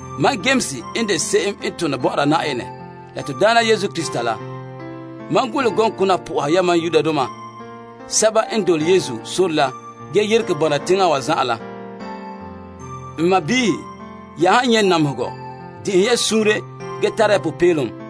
Mam Yames n de se'em n tone bɔ'ɔra Na'ayenɛ la to Daana Yesu Krista la. Mam golehɛ gɔŋkona po'oha yamam Yenɛ nɛreba la n yeregɛ bɔna teŋa wa zan'an la. N sɔɔnrɔ, ya han nyɛta namehegɔ yema yema, dekɛ ya dɛ te la dɛna zusoŋɔ.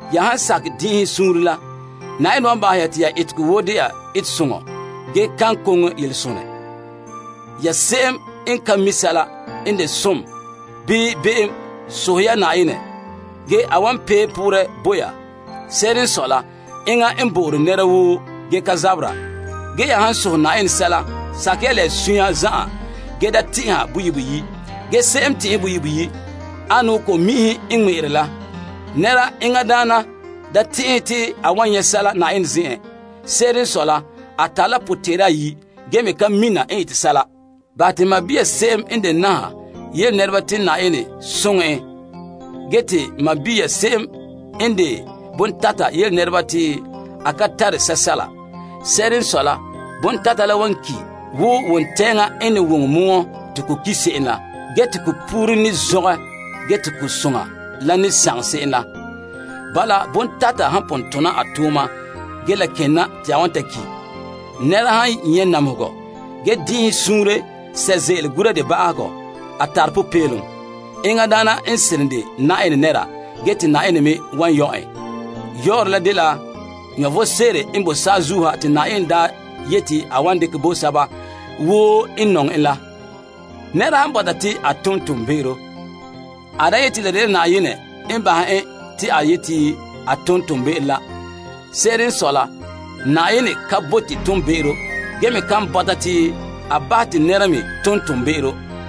Ya han sakɛ din'inhen suunre la, Na'ayenɛ wan bahɛ te ya etegɔ woo de'a etesoŋɔ gee kan koŋe yelesonɛ. Ya se'em n ka mi' sɛla n de som bii be'em sohɛ ya Na'ayenɛ, gee a wan pee poorɛ bo ya. Se'ere n sɔe la, enŋa n bo'ore nɛra woo gee ka ganhera. Ge ya han sohɛ Na'ayenɛ sɛla, sakɛ ya la ya sunya zan'an gee da tɛn'ɛha boyi' boyi', gee se'em n tɛn'ɛhe boyi' boyi' ane wo ko'mi'inhe n ŋmɛ'ɛra la. Nɛra enŋa daana da tɛn'ɛha te a wan nyɛ' sɛla Na'ayenɛ zen'en. Se'ere n sɔe la, a tare la potɛn'ɛra ayi', a ka ze'a bɔberɛ yenɛ n ete sɛla woo. Bahɛ te n sɔɔn se'em n de naha yele nɛreba te Na'ayenɛ n soŋɛ en. Ge te sɔɔn se'em n de bontata yele nɛreba te a ka tare sɛsɛla. Se'ere n sɔe la, bontata la wan ki' wo wontɛɛŋa n ne woŋɛ mɔɔ te ko ki' se'em la. Te puru ne zɔngɛ gee te ko soŋa la ne sagom se'em la. Bala, bontata han pon tona a tooma gee la ken na te a wan ta ki'. Nɛra han nyɛ' namehegɔ ge dɛna birikina paɛ ba'ahegɔ, a tare popeelom. Enŋa daana n seren de Na'ayenɛ nɛra gee te Na'ayenɛ me wan yɔ' en. Yɔɔrɛ la dela vom sebo n bo saazuo ha te Na'ayenɛ daa yeti a wan dekɛ bo sɛba woo n nɔŋɛ en la. Nɛra han bɔta te a tom toonbe'ero, a da yeti la dela Na'ayenɛ n bahɛ en te a yeti a tom toonbe'ero la. Se'ere n sɔe la, Na'ayenɛ ka bote toonbe'ero ge me kan bɔta te a bahɛ te nɛra me tom toonbe'ero.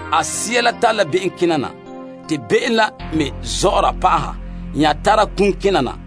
A koŋkoma'ahom la tare la be'em kena na, te be'em la me zɔ'ɔra pa'aha nya tara kum kena na.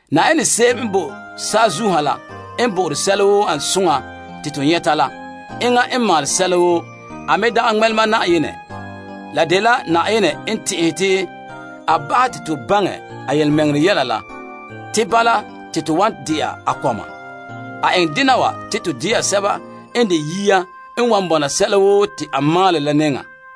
Na'ayenɛ se'em n bo saazuo ha la n bo'ore to sɛla woo n ane soŋa te to nyɛta la. Enŋa n maalɛ sɛla woo, a me dagɛ ŋmɛlema Na'ayenɛ. La dela Na'ayenɛ mɛŋa sunboolom te a bahɛ te to baŋɛ a yelemɛŋɛrɛ yɛla la te bala te to wan dena a kɔma. A eŋɛ dena wa te to dena sɛba n de yia n wan bɔna sɛla woo te a maalɛ la nɛŋa.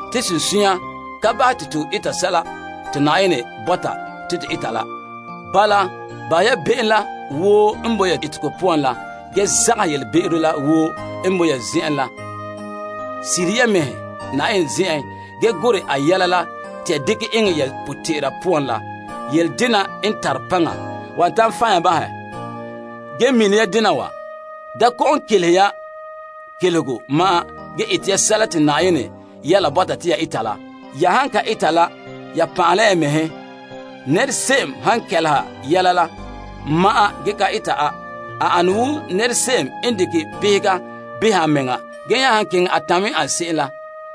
Te sunsunya ka bahɛ te to eta sɛla te Yenɛ bɔta te to eta la. Bala, bahɛ ya be'em la woo n bo ya etegɔ poan la gee zagahɛ yelebe'ero la woo n bo ya zen'en la. Sirihe ya mɛhe Yenɛ nɛŋa ge gorɛ a yɛla la te a dekɛ eŋɛ ya potɛn'ɛra poan la. Yeledena n tare paŋa wan ta'an fan' ya bahɛ. Ge mini ya dena wa. Da kɔ'ɔn kelehe ya kelehego ma'an ge ete ya sɛla te Na'ayenɛ yɛla la bɔta te ya eta la. Ya han ka eta la, ya pan'ahe la ya mɛhe. Nɛra se'em han kɛleha yɛla la ma'an ge ka eta a, a ane wo nɛra se'em n dekɛ beheŋa beha a mea nɛŋa ge nya han keŋɛ a tamɛ en ane se'em la.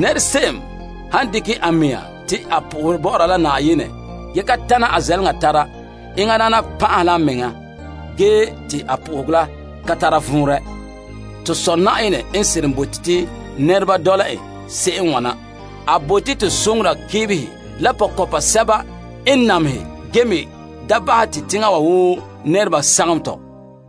Se'em han dekɛ a mɛŋa te a po'ohɛ bɔ'ɔra la Yenɛ ge ka tana a zɛleŋa tara, enŋa daana pan'ahe la a mea gee te a po'ohegɔ la ka tara vɔnrɛ. To Sɔ' Na'ayenɛ n bote te nɛreba dɔla en se'em n wana. A bote to soŋora keebehe la pɔkɔnpa sɛba n namehe ge me da bahɛ te teŋa wa woo nɛreba sagom tɔ.